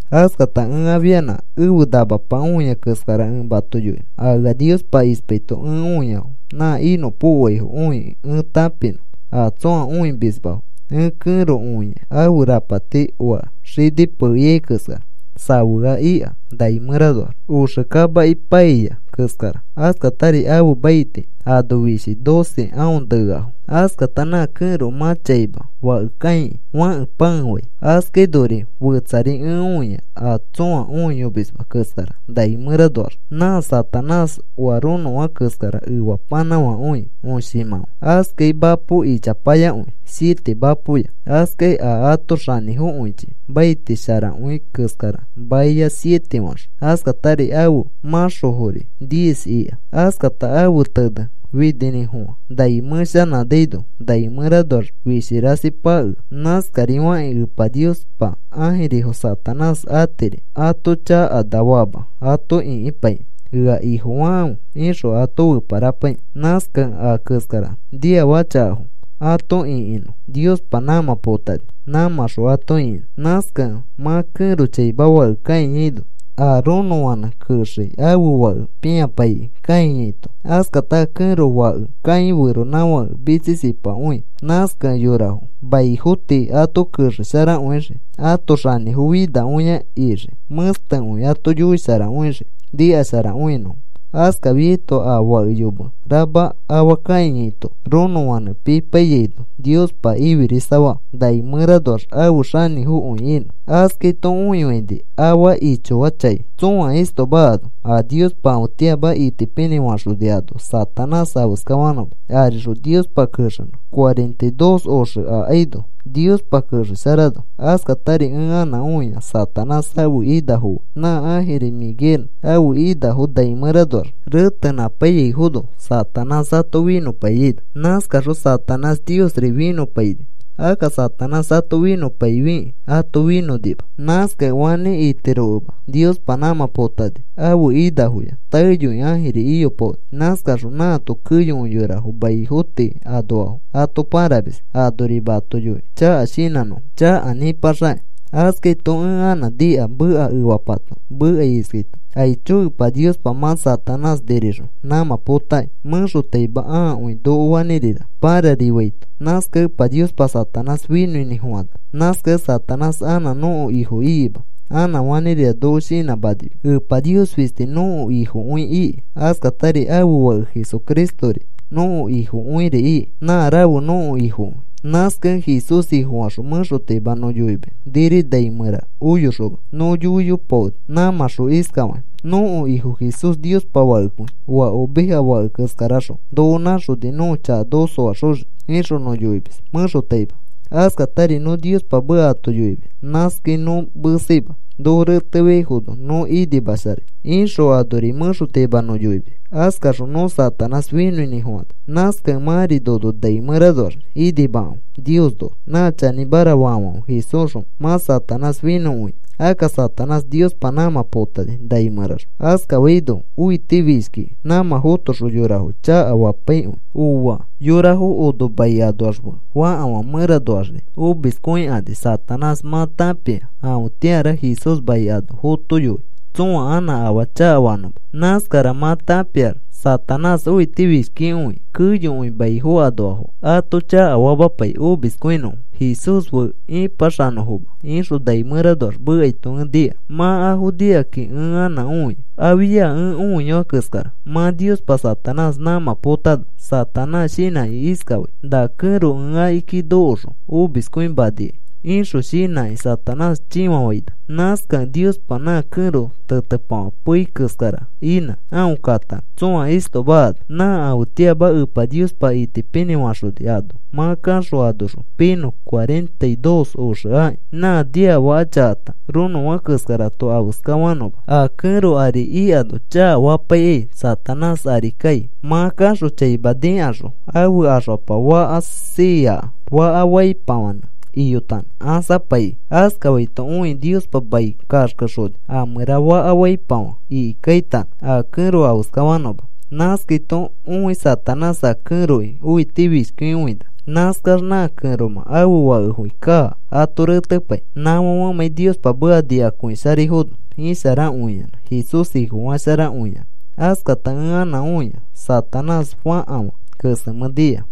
Askata ẽ afianã ẽfe namapa õia keskara ẽ mato yoinõ a ea Niospa ispaito ẽ õiafo nã inõpokoaifo õikĩ ẽ tãpinõ a tsõa õimismafo. Ẽ kẽro õia ãfe rapati oa xini pee ikai keskara safea ika nai mẽranoax. Oxe kamaki paiya keskara. Askatari ãfe maiti ano fishi doce aõ neafo. Askata nã kẽro mã chaima fake kãikĩ, fãke pãefai. Askainori fetsari ẽ õia a tsõa õiyomisma keskara nai mẽranoax. Nã Satanás oa ronofã keskara efapanãfakõi õshimãfa, askai mapo ichapayakõi siete mapoya, askai a ãto xanĩfokõichi maiti sharakõi keskara maiya siete faxõ, askatari ãfe mãxofori diez ika. Askata ãfe tene fininĩfofã nai mẽshanãnaino nai mẽranoax fishi rasi pakea. (Naskarifakĩ Epa Niospa ãjirifo Satanás atiri ato chakana fama ato ĩkipaikĩ, “Ea ifofakãfe,” ixõ ato feparapaikĩ. Nãskakẽ a keskara niafaka chakafo ato ĩkinõ Niospa nãmã potani nãmãxõ ato ĩkinõ.) Nãskakẽ mã kẽro chaima fake kãiyaino, a ronofãnẽ kexei ãfe fake pĩapaikĩ kãiyaito. Askata a kẽro fake kãi feronãfake mitsisipakõi. Nãskakẽ yorafo manifo tii, ato kexesharakõixii ãto xanĩfo finakõia ixii. Mẽstekõi ato yoisharakõixii nikasharakõinõfo. Askafiaito a fake yome rama afa kãiyaito ronõfãnẽ pipaiyaino Niospa ifirisafaa nai mẽranoax afe xanĩfokõi inõ. Askaito õifaini afa ichoachãi tsõa istoma ano a Niospa afetĩama itipinĩ faxoni ano Satanás afeskafanõma arixõ Niospa kexenõ cuarenta y dos oxe akaino Niospa kexesharanõ. Askatari ẽ anã õia Satanás ãfe inafo fe nã ãjiri Miguel ãfe inafo nai mẽranoax retenãpaiyaifono Satanás ato finõpaiyaino. Nãskaxõ Satanás Niosri finõpaini. Akka Satanás ato finõpaifikĩ ato finõnima. Nãskakẽ fanĩ itirokẽma Niospa nãmã potani ãfe inafoya. Taeyoi ãjiri iyopaoni. Nãskaxõ nãato keyokõi yorafo maifo tii anoafo ato pãramis anorima ato yoikĩ chaka shinãnõfo, chaka nĩpaxakakĩ. Askaito ẽ anã nika meka efapato mekai iskaito: “¡Aicho! Epa Niospa mã Satanás nirixõ nãmã potaki, mẽxotaima ãakõi noko fanĩrira pãrarifaito. Nãskakẽ Epa Niospa Satanás finõinĩfofana. Nãskakẽ Satanás anã nõko ifo ikima, anã fanĩrira noko shinãmanima, Epa Nios fisti nõko Ifokõi iki. Askatari ãfe Fake Jesucristori nõko Ifokõiri iki. Nã rafe nõko Ifokõi. Nãskakẽ Jesús Ifofaxõ mẽxotaima nõ yoimis niri nai mẽra oyoxoma nõ yoiyopaoni nãmãxõ iskafakĩ: ‘Nõko Ifo Jesús, Niospa Fakekõi, oa oveja fake keskaraxõ noko nãxoni nõko chaka noko soaxoxiki,’ ixõ nõ yoimis mẽxotaima. Askatari nõ Niospa meka ato yoimis. Nãskai nõ meseima, ‘Noko retefiaifono, nõ inimasharai,’ ixõ anori mẽxotaima nõ yoimis. Askaxõ nõ Satanás finõinĩfofana. Nãskakẽ mãri nono nai mẽranoax inimakãfe Niosnoax. Nã chanĩmara faafãfe Jesúsxõ mã Satanás finõkõiafo. Akka Satanás Niospa nãmã potani nai mẽraxõ. Askafaino õitifishkiki nãmã fotoxõ yorafo chakafapaikõi. ¡Ooa! Yorafo ono mai anoax fe fakafã mẽranoaxri omiskõikani. Satanás mã tãpia afetĩara Jesús mai ano fotoai tsõa anã afaa chakafanõma. Nãskara mã tãpiax Satanás õitifishkikõikĩ keyokõi maifo anoafo ato chakafamapai omiskõinõfo Jesús fe ĩpaxanõfoma,” ixõ nai mẽranoax mekaito ẽ nika. Mã afo nikakĩ ẽ anã õia afia ẽ õiyoa keskara. Mã Niospa Satanás nãmã potano, Satanás shinãkĩ iskafai: “Na kẽro ẽ akiki nokoxõ omiskõimanikai,” ixõ shinãki Satanás chĩfafaina. Nãskakẽ Niospa nã kẽro tetepafã pei keskara inã aõ katanõ tsõa istoma ano. Nã afetĩama Epa Niospa itipinĩ faxoni ano mã kaxõ anoxõ piinõ cuarenta y dos oxe akĩ, nã niafaka chakata ronõfã keskarato afeskafanõma. A kẽro ari ikano chakafapaikai Satanás ari kai. Mã kaxõ chaima nikaxõ ãfe axfapa faka siiakĩ faka faipafãnẽ iyotanõ ãsapaikĩ. Askafaito õikĩ Niospa mai kaxkexoni a mẽra faka faipafã ikikaitanõ a kẽro afeskafanõma. Nãskaito õi Satanás a kẽroki õitifishkikõina. Nãskax nã kẽromã ãfe fakefoki kaa ato retepai, nãfãfemãi Niospa meka nikakõisharaifono isharakõiyanã Jesús Ifofasharakõiyanã. Askata ẽ anã õia Satanás fakafã kesemẽ nia.